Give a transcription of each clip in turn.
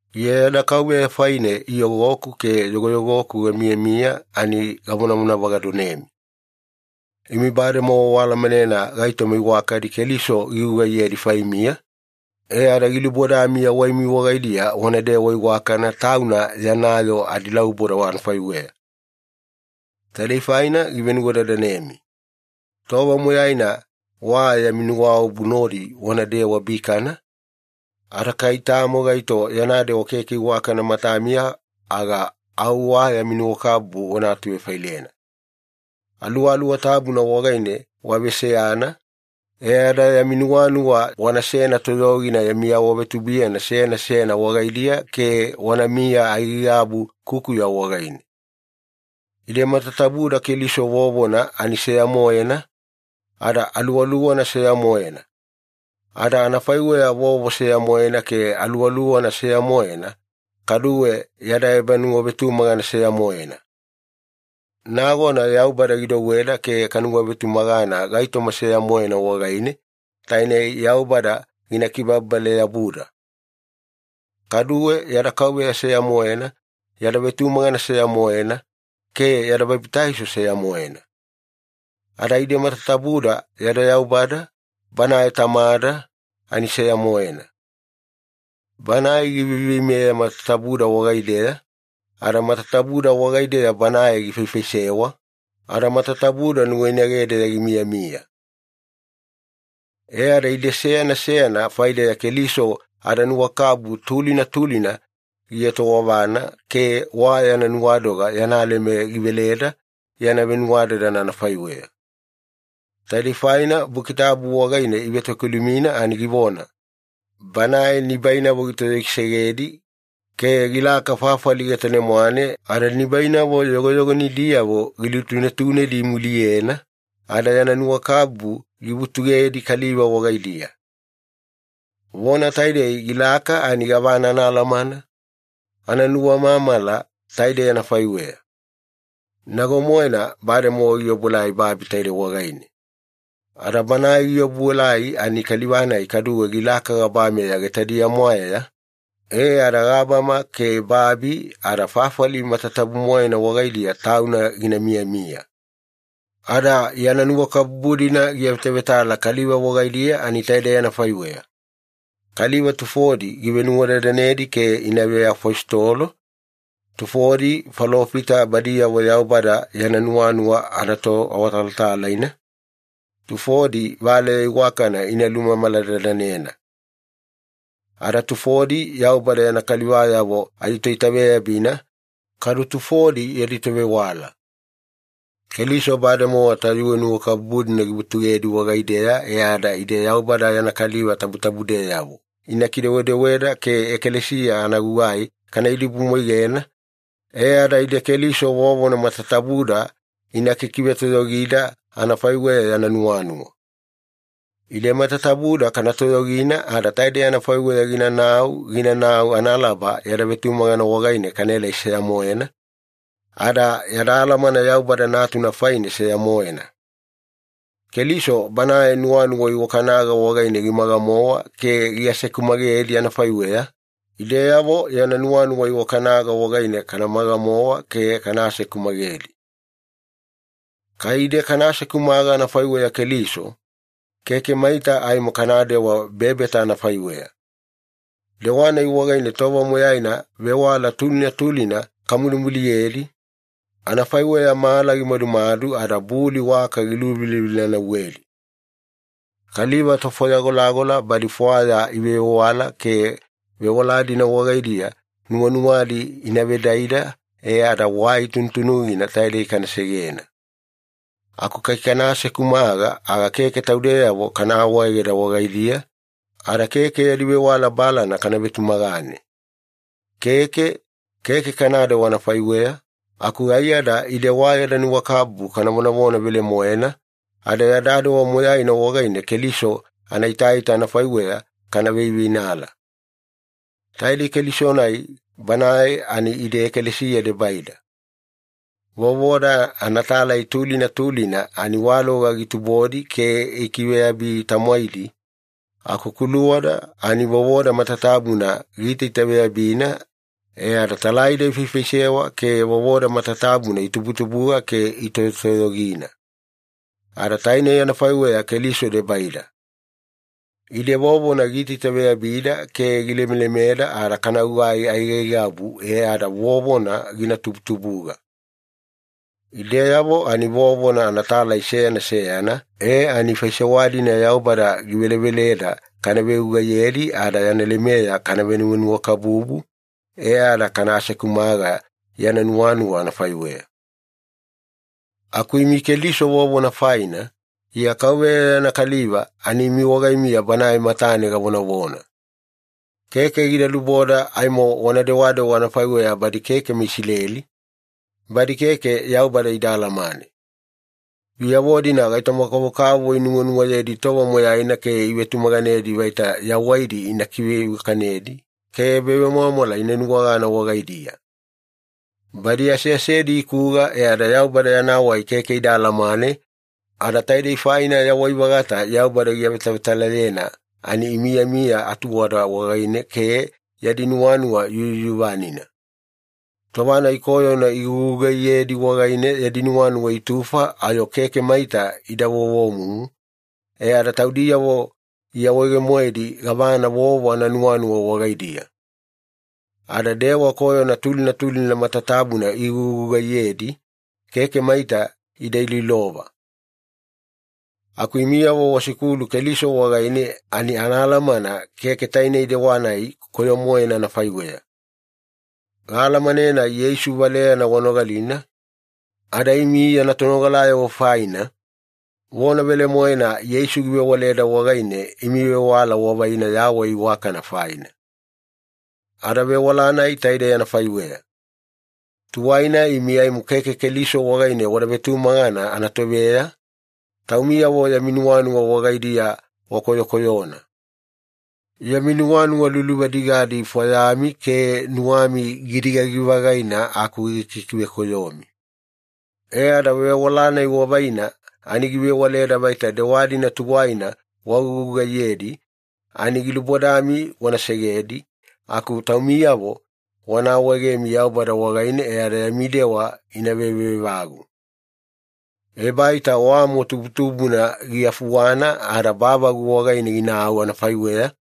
Iya yada Kauveya faine iyogoku ke yogoyogoku gamiyamiya ani gavonavona vagadonemi. Imi bademowa waalamanena gaitoma iwakadi Keliso gigugaiyedi faimiya, e ada gilubodami yawaimi wagaidiya wanadewa iwakana Tauna yana yoo adilauboda anafaiweya. Taidei faina givenuwadadanemi. Tova moyaina wa yami nuwaobu nodi wanadewa bikana, ada kai tamo gaito yana dewa keke iwakana matamiya aga au wa yami nuwakabubu wana atuvefailena. Aluwaluwa Tabuna wagaine waveseyana, e ada yami nuwanuwa wanasena toyogina yami awavetubuiyana seyana seyana wagaidiya ke wanamiya aigaigabu kukuya wagaine. Ide matatabuda Keliso vovona ani seya-moena, ada Aluwaluwana seya-moena. Ada anafaiweya vovo seya-moena ke Aluwaluwana seya-moena, kaduwe yada ebanuwavetumagana seya-moena. Nagona Yaubada gidouweda ke kanuwavetumagana gaitoma seya-moena wagaine, tainei Yaubada gina kibababale-yabuda. Kaduwe yada Kauveya seya-moena, yada vetumagana seya-moena, ke yada babitaiso seya-moena. Ada ide matatabuda yada Yaubada, Banae Tamada, ani seya-moena. Banae giveiveimeya matatabuda wagaideya, ada matatabuda wagaideya Banae gifaifaisewa, ada matatabuda nuwainagedeya gimiyamiya. E ada ide seyana seyana faideya Keliso adanuwakabubu tulina tulina gietowavana ke wa yana nuwadoga yana leme giveleda yana venuwadadana anafaiweya. Taidei faina Buki Tabu wagaine ivetokilumina ani givona, “Banae nibainavo gitoyogisegedi ke gilaka fafali getane-mwane ada nibainavo yogoyogonidiyavo gilutunetunedi imuliyena, ada yana nuwakabubu givutugedi kaliva wagaidiya.” Vona taidei ‘gilaka’ ani gavana anaalamana? Ananuwamamala taidei anafaiweya. Nago-moena bademowa giobuelai babi taidei wagaine. Ada Banae giobuelai ani Kaliva-nai kaduwe gilaka gabama getadiya-mwaeya, e ada gabama ke babi ada fafali matatabu-moena wagaidiya Tauna gina miyamiya. Ada yana nuwakabubu-dina giavetavetala kaliva wagaidiya ani taidei anafaiweya. Kaliva tufodi givenuwadadanedi ke ina veafositolo, tufodi falofita badiyavo Yaubada yana nuwanuwa anatoawatalatalaina, tufodi Valeya Iwakana ina lumamala-dadanena. Ada tufodi Yaubada yana kalivayavo aditoitaveyabina, kadu tufodi yadi tovewala. Keliso bademowa tayuwe nuwakabubu-dina givutugedi wagaideya e ada ide Yaubada yana kaliva tabutabudeyavo ina kidewadewada ke ekalesiya anagugai kana idibumwaigena, e ada ide Keliso vovona matatabuda ina kikivetoyogida anafaiweya yana nuwanuwa. Ide matatabuda kana toyogina ada taidei anafaiweya ginanau ginanau analaba yada vetumagana wagaine kaelai seya-moena, ada yada alamana Yaubada Natuna faine seya-moena. Keliso Banae nuwanuwa iwakanaga wagaine gimaga-mowa ke giasekumagedi anafaiweya, ideyavo yana nuwanuwa iwakanaga wagaine kana maga-mowa ke kana asekumagedi. Kai ide kana asekumaga anafaiweya Keliso, keke maita aimo kanadewa bebeta anafaiweya. Dewa-nai wagaine tova moyaina vewala tulina tulina kamulimuliyedi, anafaiweya mala gimadumadu ada buli waka giluvilavila-nauwedi. Kaliva tofwaya golagola badi fwaya ivevewala ke vewala-dina wagaidiya nuwanuwadi ina vedaida e ada wai tunutunugina taidei kana segena. Aku kai kana asekumaga, aga keke taudeyavo kana awaegeda wagaidiya ada keke yadi vewala balana kana vetumagane. Keke, keke kanadewa anafaiweya, aku aiyada ide wa yada nuwakabubu kana vonavona velemoena, ada yada dewa moyaina wagaine Keliso anaitaita anafaiweya kana veiveinala. Taidei Keliso-nai Banae ani ide ekalesiya debaida. Vovoda anatalai tulina tulina ani waloga gitubodi ke gikiveyabi-tamwaidi, aku kuluwada ani vovoda matatabuna giitaitaveyabina e ada talaida ifaifaisewa ke vovoda matatabuna itubutubuga ke itoyotoyogina. Ada tainei anafaiweya Keliso debaida. Ide vovona giitaitaveyabida ke gilemelemeda ada kana gugai aigaigabu e ada vovona gina tubutubuga. Ideyavo ani vovona anatalai seyana seyana e ani faisewa-dina Yaubada giveleveleda kana vegugaiyedi ada yana lemeya kana venuwanuwakabubu, e ada kana asekumaga yana nuwanuwa anafaiweya. Aku imi Keliso vovona faina, Iya Kauveya yana kaliva ani imi wagaimiya Banae matane gavonavona. Keke gida luboda aimo wana dewadewa anafaiweya badi keke meIsileli, badi keke Yaubada ida alamane. Biyavo-dina gaitoma-kavokavovo inuwanuwayedi tova moyaina ke ivetumaganedi vaita yawaidi ina kiveiwakanedi ke ebavemwamwala ina nuwagana wagaidiya. Badi aseasedi ikuga e ada Yaubada yana wai keke ida alamane, ada taidei faina yawai-vagata Yaubada giavetavetalayena ani imiyamiya atuwada wagaine ke yadi nuwanuwa yuyuvanina. Tova-nai koyona igugugaiyedi wagaine yadi nuwanuwa itufa ayo keke maita ida vovomumu, e ada taudiyavo iawaege-moedi gavana vovo ananuwanuwa wagaidiya. Ada dewa koyona tulina tulina matatabuna igugugaiyedi, keke maita ida iloilova. Aku imiyavo wasikulu Keliso wagaine ani anaalamana keke tainei dewa-nai koyo-moena anafaiweya. Gaalamanena Yeisu valeyana wanogalina, ada imi yana tonogalayavo faina, vona velemoena Yeisu givewaleda wagaine imi vewala wavaina yawai iwakana faina. Ada vewala-nai taidei anafaiweya. Tuwaina imi aimo keke Keliso wagaine wada vetumagana anatoveya, taumiyavo yami nuwanuwa wagaidiya wakoyokoyona. Yami nuwanuwa luluvadigadi ifwayami ke nuwami gidigagi-vagaina aku gikikivekoyomi. E ada vewala-nai wavaina ani givewaleda vaita dewa-dina tuwaina wagugugaiyedi, ani gilubodami wana segedi aku taumiyavo wana awaegemi Yaubada wagaine e ada yami dewa ina veveevagu. Ebaita wamo tubutubuna giafuwana ada bavagu wagaine ginau anafaiweya,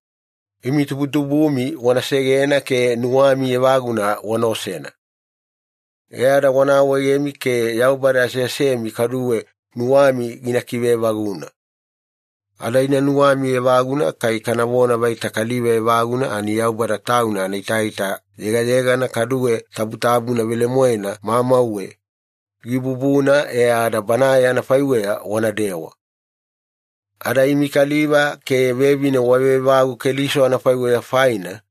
imi tubutubumi wana segena ke nuwami evaguna wana osena. E ada wana awaegemi ke Yaubada aseasemi kaduwe nuwami gina kiveevaguna. Ada ina nuwami evaguna kai kanavona vaita kaliva evaguna ani Yaubada Tauna anaitaita yegayegana kaduwe tabutabuna velemoena mamauwe, gibubuna e ada Banae anafaiweya wanadewa. Ada imi kaliva ke vevine waveevagu Keliso anafaiweya faina,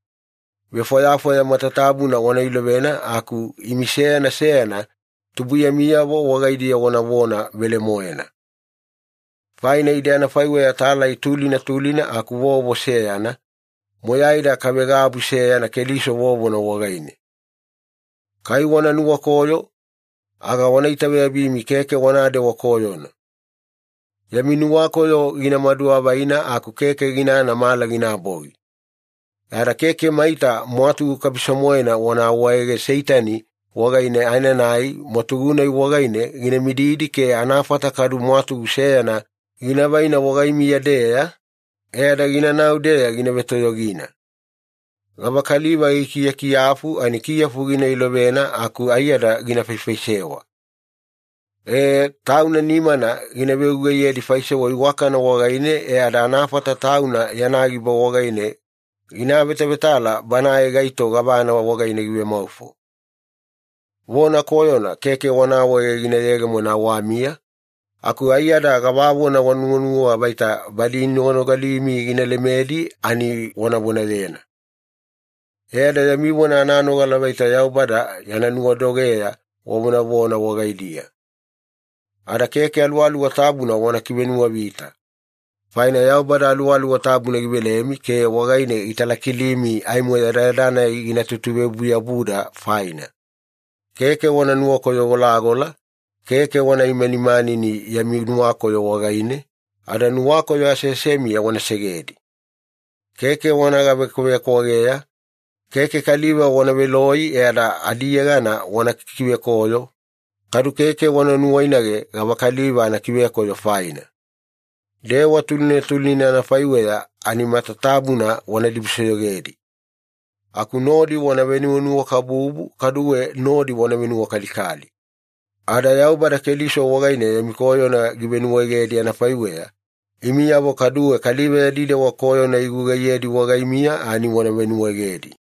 vefwayafwaya matatabuna wana ilovena aku imi seyana seyana tubuiyamiyavo wagaidiya wanavona velemoena. Faina ide anafaiweya talai tulina tulina aku vovo seyana, moyaida kavegabu seyana Keliso vovona wagaine. Kai wana nuwakoyo, aga wana itaveyabimi keke wanadewa koyona. Yami nuwakoyo gina maduavaina aku keke ginana mala ginabogi. E ada keke maita mwatugu kabiso-moena wana awaege Seitani wagaine aenanai mwatugu-nai wagaine gina mididi ke anafata kadu mwatugu seyana gina vaina wagaimiya-deya, e ada ginanau-deya gina vetoyogina. Gavakaliva gikiyakiyafu ani kiyafu gina ilovena aku aiyada gina faifaisewa. Ee, tauna nimana gina vegugaiyedi faisewa iwakana wagaine e ada anafata tauna yana giba wagaine gina avetavetala banae gaito gavana wagaine givemaufo. Vona koyona keke wana awaege gina yegemona awamiya, aku aiyada gavavona wanuwanuwa vaita badi inoganogalimi gina lemedi ani wana vonayena. E ada yami vona ananogala vaita Yaubada yana nuwadogeya wavonavona wagaidiya. Ada keke Aluwaluwa Tabuna wana kivenuwavita. Faina Yaubada Aluwaluwa Tabuna givelemi ke wagaine gitalakilimi aimo yadayada-nai gina tutuveobu-yabuda faina. Keke wana nuwakoyo-golagola, keke wana imanimanini yami nuwakoyo wagaine, ada nuwakoyo aseasemiya wana segedi. Keke wana gavekwavekwageya, keke kaliva wana veloi e ada adiyegana wana kikivekoyo, kadu keke wana nuwainage gavakaliva anakivekoyo faina. Dewa tulina tulina anafaiweya ani matatabuna wana dibusoyogedi. Aku nodi wana venuwanuwakabubu kaduwe nodi wana venuwakalikali. Ada Yaubada Keliso wagaine yami koyona givenuwaegedi anafaiweya, imiyavo kaduwe kaliva yadi dewa koyona igugaiyedi wagaimiya ani wana venuwaegedi.